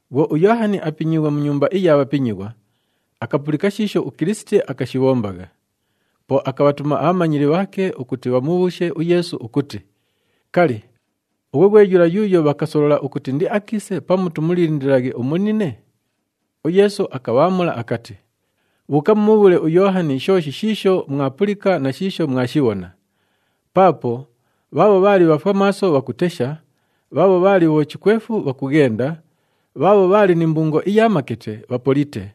Bhwo uYoohani apinyiighwe mu nyumba iya bhapinyighwa, akapulika shiisho uKilisiti akashibhombagha. Po akabhatuma abhamanyili bhaake ukuti bhamubhuushe uYeesu ukuti, “Kali, ughwe ghwe yula yuuyo bhakasolola ukuti indiakiise pamu tumulindililaghe umunine?” UYeesu akabhaamula akati, “Bhuuka mumubhuule uYoohani shooshi shiisho mwapulika na shiisho mwashibhona. Paapo bhaabho bhaali bhafwamaaso bhakutesha, bhaabho bhaali bhochikwefu bhakughenda, bhaabho bhaali ni mbungo iya makete bhapolite,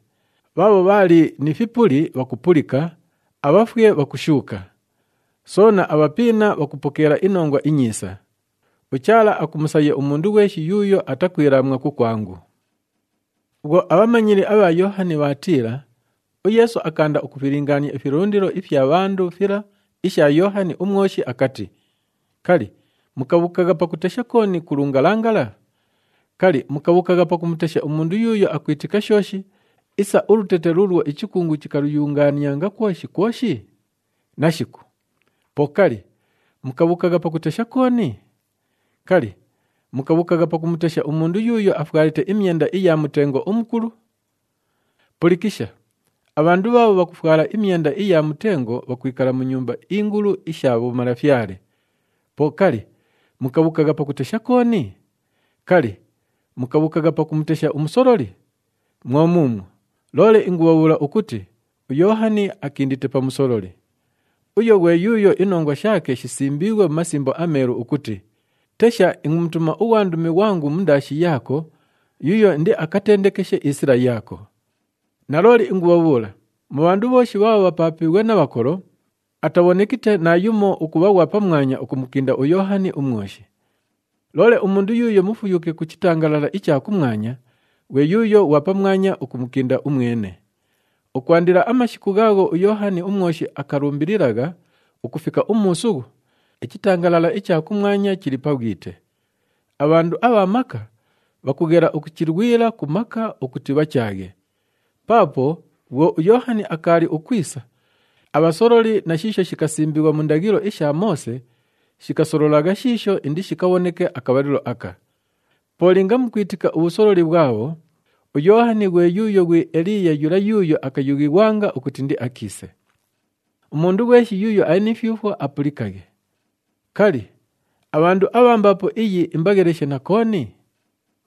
bhaabho bhaali ni fipuli, bhakupulika, abhafwe bhakushuuka. Soona, abhapiina bhakupokeela iNongwa iNyiisa. UChaala akumusaya umundu ghweshi yuuyo atakwilaamwa kukwangu.” Bhwo abhamanyili abha Yoohani bhaatiila, uYeesu akaanda ukufilingaania ifilundilo ifya bhandu fila isha Yoohani uMwoshi akati, “Kali, mukabhuukagha pakutesha kooni ku lungalangala? Kali, mukabhuukagha pakumutesha umundu yuuyo akwitika shooshi isa ulutete luulwo ichikungu chikaluyungaanianga kwoshi kwoshi? Nashiku! Po kali, mukabhuukagha pakutesha kooni? Kali, mukabhuukagha pakumutesha umundu yuuyo afwalite imyenda iya mutengo umukulu? Pulikisha, abhandu bhaabho bhakufwala imyenda iya mutengo bhakwikala mu nyumba ingulu isha bhomalafyale. Po kali, mukabhuukagha pakutesha kooni? Kali, mukabhuukagha pakumutesha umusololi? Mwo muumwo, loole ingubhabhuula ukuti uYoohani akindite pa musololi. Uyu ghwe yuuyo inongwa shaake shisimbiighwe mu Masimbo aMeelu ukuti, ‘Tesha, ingumutuma ughwandumi ghwangu mundaashi yaako yuuyo indiakatendekeshe isila yaako.’ Nalooli ingubhabhuula, mu bhandu bhooshi bhaabho bhapaapiighwe na bhakolo, atabhonekite naayumo ukubha ghwa pamwanya ukumukinda uYoohani uMwoshi. Loole umundu yuuyo mufuyuke ku chitangalala icha kumwanya, ghwe yuuyo ghwa pamwanya ukumukinda umwene. Ukwandila amashiku ghaagho uYoohani uMwoshi akalumbililagha ukufika umuusughu, ichitangalala icha kumwanya chili pa bhwite. Abhandu abha maka, bhakughela ukuchilwila ku maka ukuti bhachaaghe. Paapo bhwo uYoohani akaali ukwisa, abhasololi na shiisho shikasimbighwa mu ndaghilo isha Moose shikasololagha shiisho indishikabhoneke akabhalilo aka. Po linga mukwitika ubhusololi bhwabho, uYoohani ghwe yuuyo ghwi Eliiya yula yuuyo akayughighwanga ukuti indiakiise. Umundu ghweshi yuuyo ali ni fyufwo, apulikaghe. Kali, abhandu abha mbaapo iyi imbagheleshe na kooni?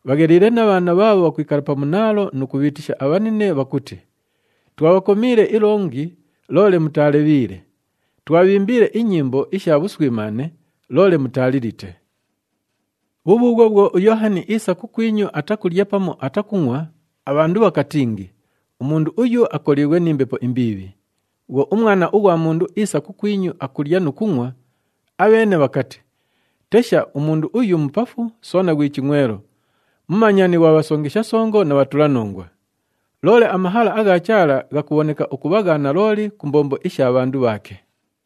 Bhagheliile na bhaana bhaabho bhakwikala pa munaalo nu kubhiitisha abhanine bhakuti, ‘Twabhakomiile ilongi, loole mutaalebhiile! Twabhiimbiile inyimbo isha bhuswimaane, loole mutaalilite!’ “Bhubhuubhwo bhwo uYoohani iisa kukwinyu, atakulya pamu atakungʼwa, abhandu bhakatingi, ‘Umundu uyu akoliighwe ni mbepo imbiibhi.’ Bhwo uMwana ughwa Mundu iisa kukwinyu, akulya nu kungʼwa, abheene bhakati, ‘Tesha! Umundu uyu mupafu soona ghwi chingʼwelo, mumanyani ghwa bhasongesha songo na bhatulanongwa!’ Loole amahala agha Chaala ghakubhoneka ukubha gha nalooli ku mbombo isha bhandu bhaake.”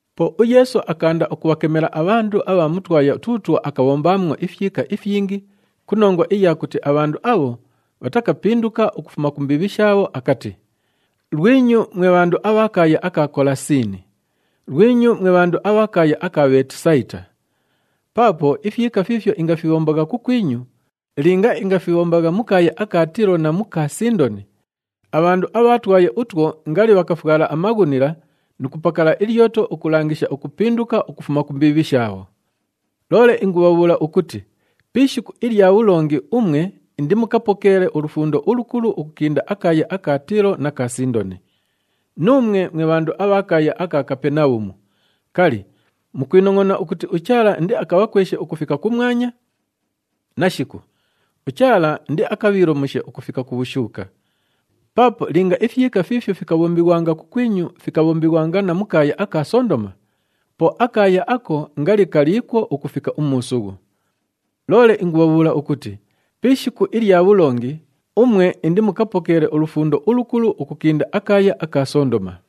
Po uYeesu akaanda ukubhakemela abhandu abha mu twaya tuutwo akabhombaamwo ifyika ifyingi ku nongwa iya kuti abhandu abho bhatakapinduka ukufuma ku mbiibhi shaabho akati, “Lwinyu mwe bhandu abha kaaya aka Kolasiini! Lwinyu mwe bhandu abha kaaya aka Bheetisayita! Paapo ifyika fiifyo ingafibhombagha kukwinyu, linga ingafibhombagha mu kaaya aka Tiilo na mu ka Sindoni, abhandu abha twaya utwo ngali bhakafwala amaghunila nu kupakala ilyoto ukulangisha ukupinduka ukufuma ku mbiibhi shaabho. Loole ingubhabhuula ukuti pi ishiku ilya bhulongi umwe indimukapokeele ulufundo ulukulu ukukinda akaaya aka Tiilo na ka Sindoni. Nuumwe mwe bhandu abha kaaya aka Kapenabhumu, kali, mukwinongʼona ukuti uChaala indiakabhakweshe ukufika kumwanya? Nashiku! UChaala indiakabhiilomushe ukufika ku bhushuuka. Paapo linga ifyika fiifyo fikabhombighwanga kukwinyu, fikabhombighwanga na mu kaaya aka Sondoma, po akaaya ako ngali kaliikwo ukufika umuusughu. Loole ingubhabhuula ukuti pi ishiku ilya bhulongi umwe indimukapokeele ulufundo ulukulu ukukinda akaaya aka Sondoma.”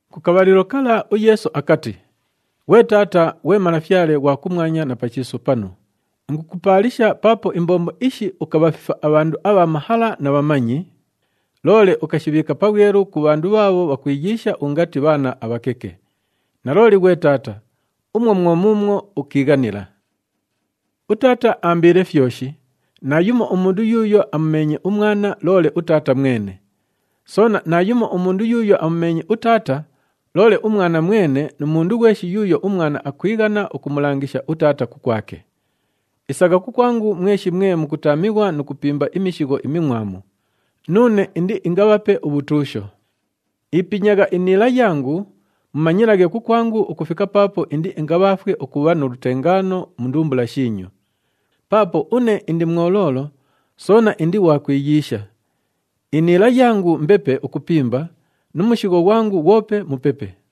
Ku kabhalilo kala uYeesu akati, “Ghwe Taata, ghwe Malafyale ghwa kumwanya na pa chiisu panu, ingukupaalisha paapo imbombo ishi ukabhafifa abhandu abha mahala na bhamanyi, loole ukashibhiika pabhwelu ku bhandu bhaabho bhakwiyiisha ungati bhaana abhakeke. Nalooli, ghwe Taata, umwo mwo muumwo ukiighanila. “UTaata aambiile fyoshi. Naayumo umundu yuuyo amumeenye uMwana, loole uTaata mwene. Soona naayumo umundu yuuyo amumeenye uTaata, loole uMwana mwene nu mundu ghweshi yuuyo uMwana akwighana ukumulangisha uTaata kukwake. “Isagha kukwangu mweshi mwe mukutaamighwa nu kupimba imishigho imingʼwamu, nuune indiingabhape ubhutuusho. Ipinyagha iniila yangu, mumanyilaghe kukwangu ukufika paapo indiingabhaafwe ukubha nu lutengaano mu ndumbula shiinyu. Paapo une indi mwoloolo soona indi ghwa kwiyiisha. Iniila yangu mbepe ukupimba nu mushigho ghwangu ghwope mupepe.”